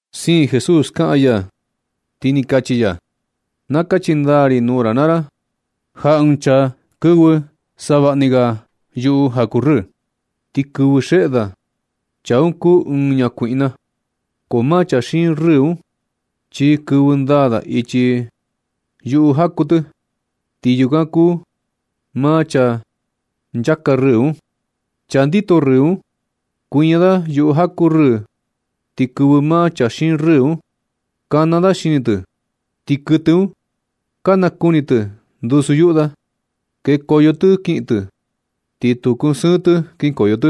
Siin Jesús kaꞌan ya, ti ni kachi ya: ―Na kachi ndaa ri nuu ra naa ra, ja ɨɨn chaa kanda savaꞌni ga yuꞌu ndaꞌa jaku rɨɨ ti kɨvɨ xeꞌe da, chaa un kuu ɨɨn ñakuiꞌna. Ko maa chaa xiin rɨɨ un chi kɨvɨ ndaa da ichi yuꞌu jaku tɨ. Ti chaa yukan kuu maa chaa nchaka rɨɨ un. Chaa ndito rɨɨ un kuiña da yuꞌu jaku rɨɨ, ti kɨvɨ maa chaa xiin rɨɨ un. Kana da xini tɨ, ti kuɨtɨ un ka nakuni tɨ ndusu yuꞌu da, kekoyo tɨ kiꞌin tɨ, ti tu kusɨɨn tɨ kinkoyo tɨ.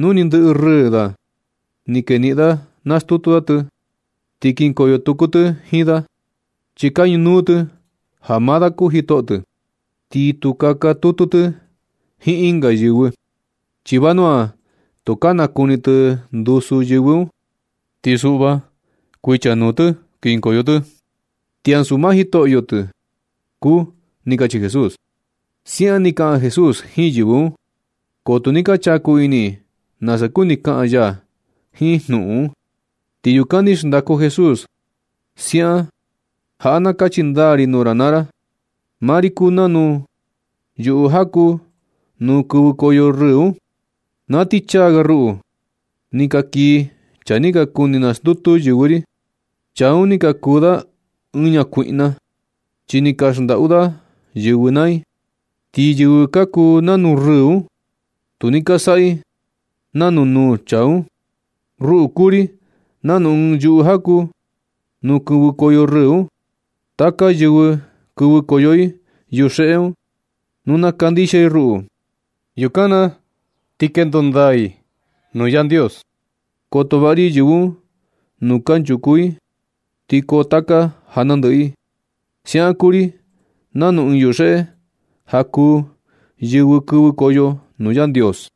Nu ni ndɨꞌɨ rɨɨ da ni keniꞌin da, nastutu da tɨ ti kinkoyo tutu tɨ jiin da, chi ka ñunuu tɨ ja maa da kuu jitoꞌo tɨ. Ti tu kaka tutu tɨ jiin ɨnga yɨvɨ, chi vanua tu ka nakuni tɨ ndusu yɨvɨ un, ti suꞌva kuichanuu tɨ kinkoyo tɨ, chi ansu maa jitoꞌo tɨ kuu ―ni kachi Jesús. Siaꞌan ni kaꞌan Jesús jiin yɨvɨ un, ko tu ni ka chaku ini i nasa kuni kaꞌan ya jiin jnuꞌun un. Ti yukan ni xndaku Jesús siaꞌan ―Jaꞌa na kachi ndaa ri nuu ra naa ra. Maa ri kuu nanu yuꞌu jaku nuu kɨvɨkoyo rɨɨ un. Na ti chaa ga ruꞌu, ni ka kii chaa ni ka kuni nastutu yɨvɨ ri. Chaa un ni ka kuu da ɨɨn ñakuiꞌna, chi ni ka xndaꞌu da yɨvɨ naa i. Ti yɨvɨ ka kuu nanu rɨɨ un, tu ni ka saꞌa i nanu nuu chaa un. Ruꞌu, kuu ri nanu ɨɨn yuꞌu jaku nuu kɨvɨkoyo rɨɨ un. Taka yɨvɨ kɨvɨkoyo i yuxeꞌe un, nu na kandixia i ruꞌu, yukan na ti kendo ndaa i nuu Yandios. Koto vaꞌa ri yɨvɨ un nuu kunchuku i, ti koo taka ja nandɨꞌɨ i. Siaꞌan kuu ri nanu ɨɨn yuxeꞌe ja kuu yɨvɨ kɨvɨkoyo nuu Yandios.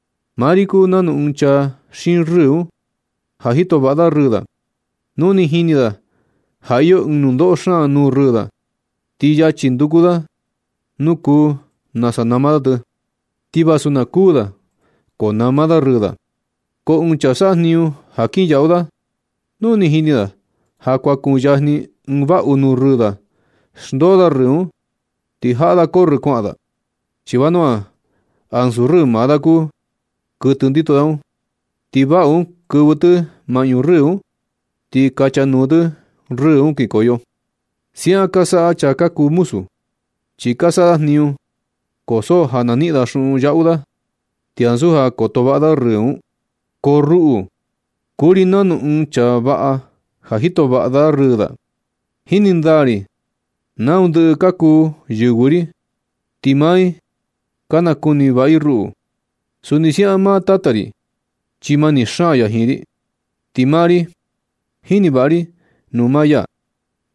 Maa ri kuu nanu ɨɨn chaa xiin rɨɨ un, ja jito vaꞌa da rɨɨ da. Nu ni jini da ja iyo ɨɨn nundoꞌo xaan nuu rɨɨ da, ti yachi nduku da nuu kuu nasa nama da tɨ. Ti vasu na kuu da, ko nama da rɨɨ da. Ko ɨɨn chaa saꞌa jniñu ja kin yaꞌu da, nu ni jini da ja kuan kuyajni ɨɨn vaꞌu nuu rɨɨ da, xndoo da rɨɨ un, ti jaꞌa da corrɨ kuaꞌan da, chi vanua ansu rɨɨ maa da kuu kuɨtɨ ndito da un. Ti vaꞌu un kɨvɨ tɨ maꞌñu rɨɨ un, ti kachanuu tɨ rɨɨ un kinkoyo. Siaꞌan ka saꞌa chaa ka kuu muzu, chi ka saꞌa da jniñu, ko so ja na niꞌin da xuꞌun yaꞌu da, ti ansu ja koto vaꞌa da rɨɨ un. Ko ruꞌu, kuu ri nanu ɨɨn chaa vaꞌa ja jito vaꞌa da rɨɨ da. Jini ndaa ri nau ndɨꞌɨ ka kuu yɨvɨ ri, ti maa i ka nakuni vaꞌa i ruꞌu. Suni siaꞌan maa Tata ri, chi mani xaan ya jiin ri, ti maa ri, jini vaꞌa ri nuu maa ya.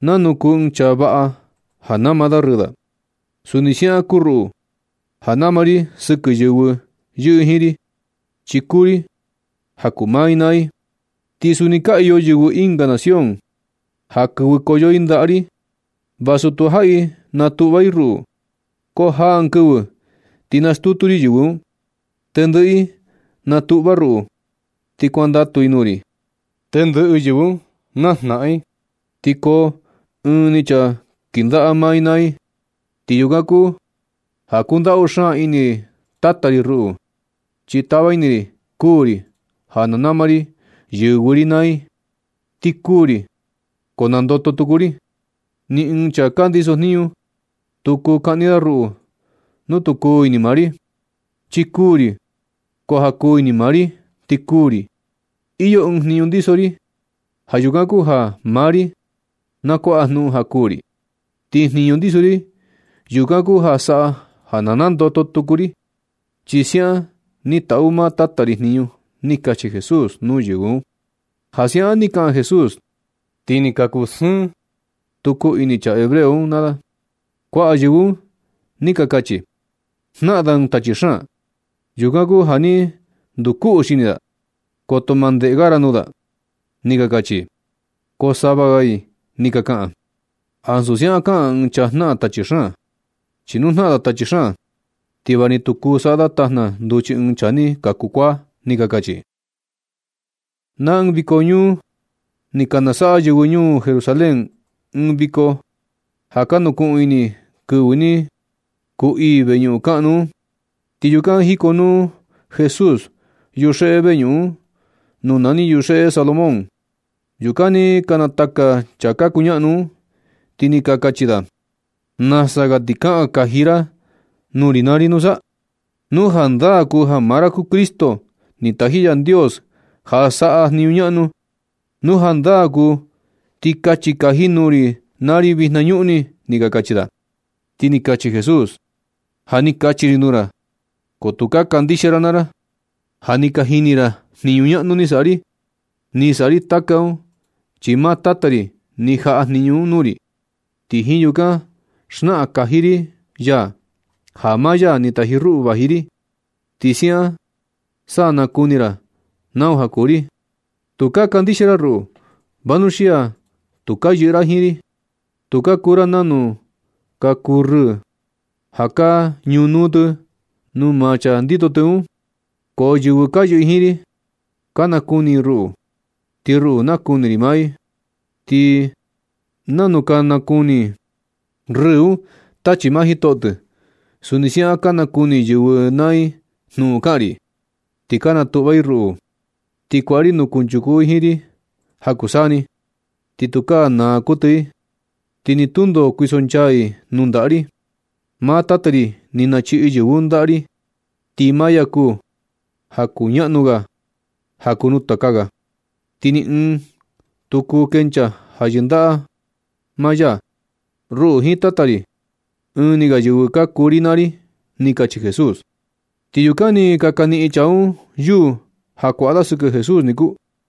Nanu kuu ɨɨn chaa vaꞌa ja nama da rɨɨ da, suni siaꞌan kuu ruꞌu ja nama ri sɨkɨ yɨvɨ yɨꞌɨ jiin ri, chi kuu ri ja kuu maa i naa i. Ti suni ka iyo yɨvɨ ɨnga nación ja kɨvɨkoyo i ndaꞌa ri, vasu tujaꞌi natuꞌva i ruꞌu. Ko jaa ɨɨn kɨvɨ ti nastutu ri yɨvɨ un. Tendɨꞌɨ i natuꞌva ruꞌu, ti kuandatu i nuu ri. Tendɨꞌɨ yɨvɨ un najnaꞌan i, ti koo ɨɨn ni chaa kɨndaꞌa maa i naa i. Yukan kuu ja kundaꞌu xaan ini Tata ri ruꞌu, chi tava ini ri kuū ri ja na nama ri yɨvɨ ri naa i. Ti kuū ri, ko nandoto tuku ri. Ni ɨɨn chaa ka ndiso jniñu, tu kuu kaꞌni da ruꞌu nu tu kuu ini maa ri. Chi kuū ri, ko ja kuu ini maa ri ti kuū ri. Iyo ɨɨn jniñu ndiso ri, ja yukan kuu ja maa ri na kuaꞌa jnuꞌun ja kuū ri. Ti jniñu ndiso ri, yukan kuu ja saꞌa ja na nandoto tuku ri, chi siaꞌan ni taꞌu maa Tata ri jniñu ―ni kachi Jesús nuu yɨvɨ un. Ja siaꞌan ni kaꞌan Jesús, ti ni ka kusɨɨn tuku ini chaa hebreo un naa da. Kuaꞌa yɨvɨ un ni ka kachi: ―Jnaꞌan da ɨɨn tachi xaan, yukan kuu ja ni ndukuꞌu xini da. Koto ma ndeꞌe ga ra nuu da ―ni ka kachi i. Ko sava ga i ni ka kaꞌan: ―Ansu siaꞌan kaꞌan ɨɨn chaa jnaꞌan tachi xaan. Chi nu jnaꞌan da tachi xaan, ti va ni tu kuu saꞌa da tajna nduchi ɨɨn chaa ni kaku kuaa ―ni ka kachi i. Na ɨɨn viko ñuu, ni ka nasaꞌa yɨvɨ ñuu Jerusalén ɨɨn viko ja ka nukuꞌun ini i kɨvɨ ni kuu ii veñuꞌun kaꞌnu un. Ti yukan jikonuu Jesús yuxeꞌe veñuꞌun un, nuu nani yuxeꞌe Salomón. Yukan ni ka nataka chaa ka kuñaꞌnu un, ti ni ka kachi da: ―¿Nasa ga ti sa kaꞌan kaji ra nuu ri naa ri nusa? Nu jandaa kuu ja maa ra kuu Cristo, ni taji Yandios ja saꞌa jniñu ñaꞌnu. Nu jandaa kuu ti kachi kaji nuu ri naa ri vinañuꞌni ―ni ka kachi da. Ti ni kachi Jesús: ―Ja ni kachi ri nuu ra, ko tu ka kandixia ra naa ra. Ja ni ka jini ra jniñu ñaꞌnu ni saꞌa ri. Ni saꞌa ri taka un, chi maa Tata ri ni jaꞌa jniñu un nuu ri. Ti jiin yukan xnaꞌan kaji ya ja maa ya ni taji ruꞌu vaji ri, ti siaꞌan sa na kuni ra nau ja kuu ri. Tu ka kandixia ra ruꞌu, vanuxia tu ka yɨꞌɨ ra jiin ri. Tu ka kuu ra nanu ka kuu rɨɨ ja ka ñunuu tɨ nuu maa chaa ndito tɨ un. Ko yɨvɨ ka yɨꞌɨ jiin ri, ka nakuni i ruꞌu, ti ruꞌu nakuni ri maa i. Ti nanu ka nukunuu rɨɨ un tachi maa jitoꞌo tɨ, suni siaꞌan ka nakuni yɨvɨ naa i jnuꞌun kaꞌan ri, ti ka natuꞌva i ruꞌu. Ti kuaꞌa ri nuu kunchuku i jiin ri ja kuu saa ni. Ti tukaa naa kuɨtɨ i, ti ni tundo kuisonchaa i nuu ndaꞌa ri. Maa Tata ri ni nachiꞌi yɨvɨ un ndaꞌa ri. Ti maa ya kuu ja kuñaꞌnu ga ja kuu nuu taka ga. Ti ni ɨɨn tu kuu kencha ja yɨndaꞌa maa ya. Ruꞌu jiin Tata ri, ɨɨn ni ga yɨvɨ ka kuu ri naa ri ―ni kachi Jesús. Ti yukan ni ka kaniꞌin chaa un yuu ja kuaꞌa da sɨkɨ Jesús niku.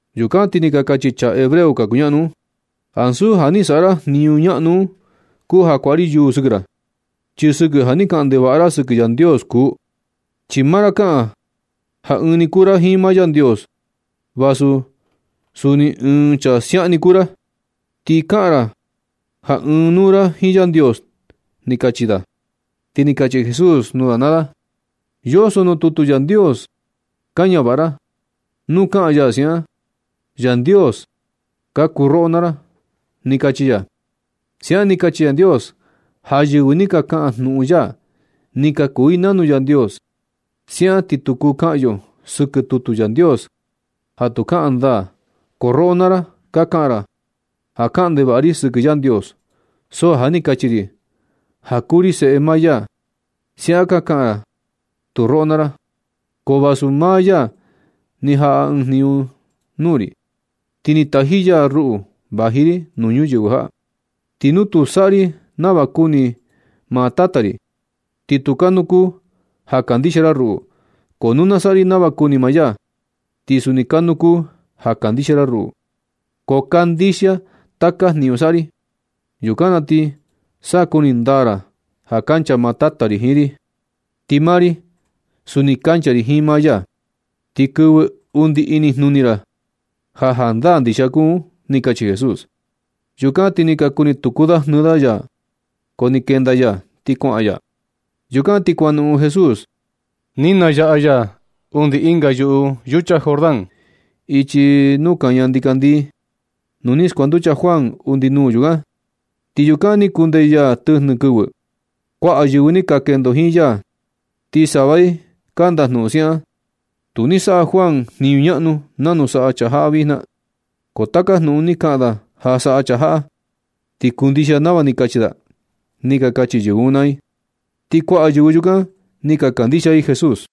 Yukan ti ni ka kachi chaa hebreo ka kuñaꞌnu un: ―Ansu ja ni saꞌa ra jniñu ñaꞌnu un kuu ja kuaꞌa ri yuu sɨkɨ ra, chi sɨkɨ ja ni kaꞌan ndevaꞌa ra sɨkɨ Yandios kuu. Chi maa ra kaꞌan ja ɨɨn ni kuu ra jiin maa Yandios. Vasu suni ɨɨn chaa siaꞌan ni kuu ra, ti kaꞌan ra ja ɨɨn nuu ra jiin Yandios ―ni ka kachi da. Ti ni kachi Jesús nuu da naa da: ―Yoso nuu tutu Yandios ka ñavaꞌa ra, nuu kaꞌan ya siaꞌan: “Yandios ka kuu roꞌo naa ra”, ni kachi ya. Siaꞌan ni kachi Yandios ja yɨvɨ ni ka kaꞌan jnuꞌun ya, ni ka kuu i nanu Yandios. Siaꞌan ti tu kuu kaꞌan yo sɨkɨ tutu Yandios ja tu kaꞌan ndaa. Ko roꞌo naa ra, ka kaꞌan ra ja kaꞌan ndevaꞌa ri sɨkɨ Yandios, so ja ni kachi ri ja kuu ri Seꞌe maa ya. Siaꞌan ka kaꞌan tu roꞌo naa ra. Ko vasu maa ya ni jaꞌa ɨɨn jniñu nuu ri, ti ni taji ya ruꞌu vaji ri nuu ñuyɨvɨ jaꞌa. Ti nu tu saꞌa ri nava kuni maa Tata ri, ti tu kanuu kuu ja kandixia ra ruꞌu. Ko nu na saꞌa ri nava kuni maa ya, ti suni kanuu kuu ja kandixia ra ruꞌu. Ko kandixia taka jniñu saꞌa ri. Yukan na ti sa kuni ndaa ra ja kancha maa Tata ri jiin ri, ti maa ri suni kancha ri jiin maa ya, ti kɨvɨ undi inijnuni ra ja jandaa ndixia kuu un ―ni kachi Jesús. Yukan ti ka kuni tuku da jnɨɨ da ya, ko ni kenda ya ti kuaꞌan ya. Yukan na ti kuanoꞌon Jesús. Ni nayaꞌa ya undi ɨnga yuꞌu yucha Jordán, ichi nuu kaña ndikandii, nuu ni skuanducha Juan undi nuu yukan, ti yukan ni kundee ya tɨjnɨ kɨvɨ. Kuaꞌa yɨvɨ ni ka kendo jiin ya, ti sava i ka ndajnuꞌun siaꞌan: ―Tu ni saꞌa Juan jniñu ñaꞌnu nanu saꞌa chaa jaꞌa vijna, ko taka jnuꞌun ni kaꞌan da ja saꞌa chaa jaꞌa, ti kundixia nava ni kachi da ―ni ka kachi yɨvɨ un naa i. Ti kuaꞌa yɨvɨ yukan ni ka kandixia i Jesús.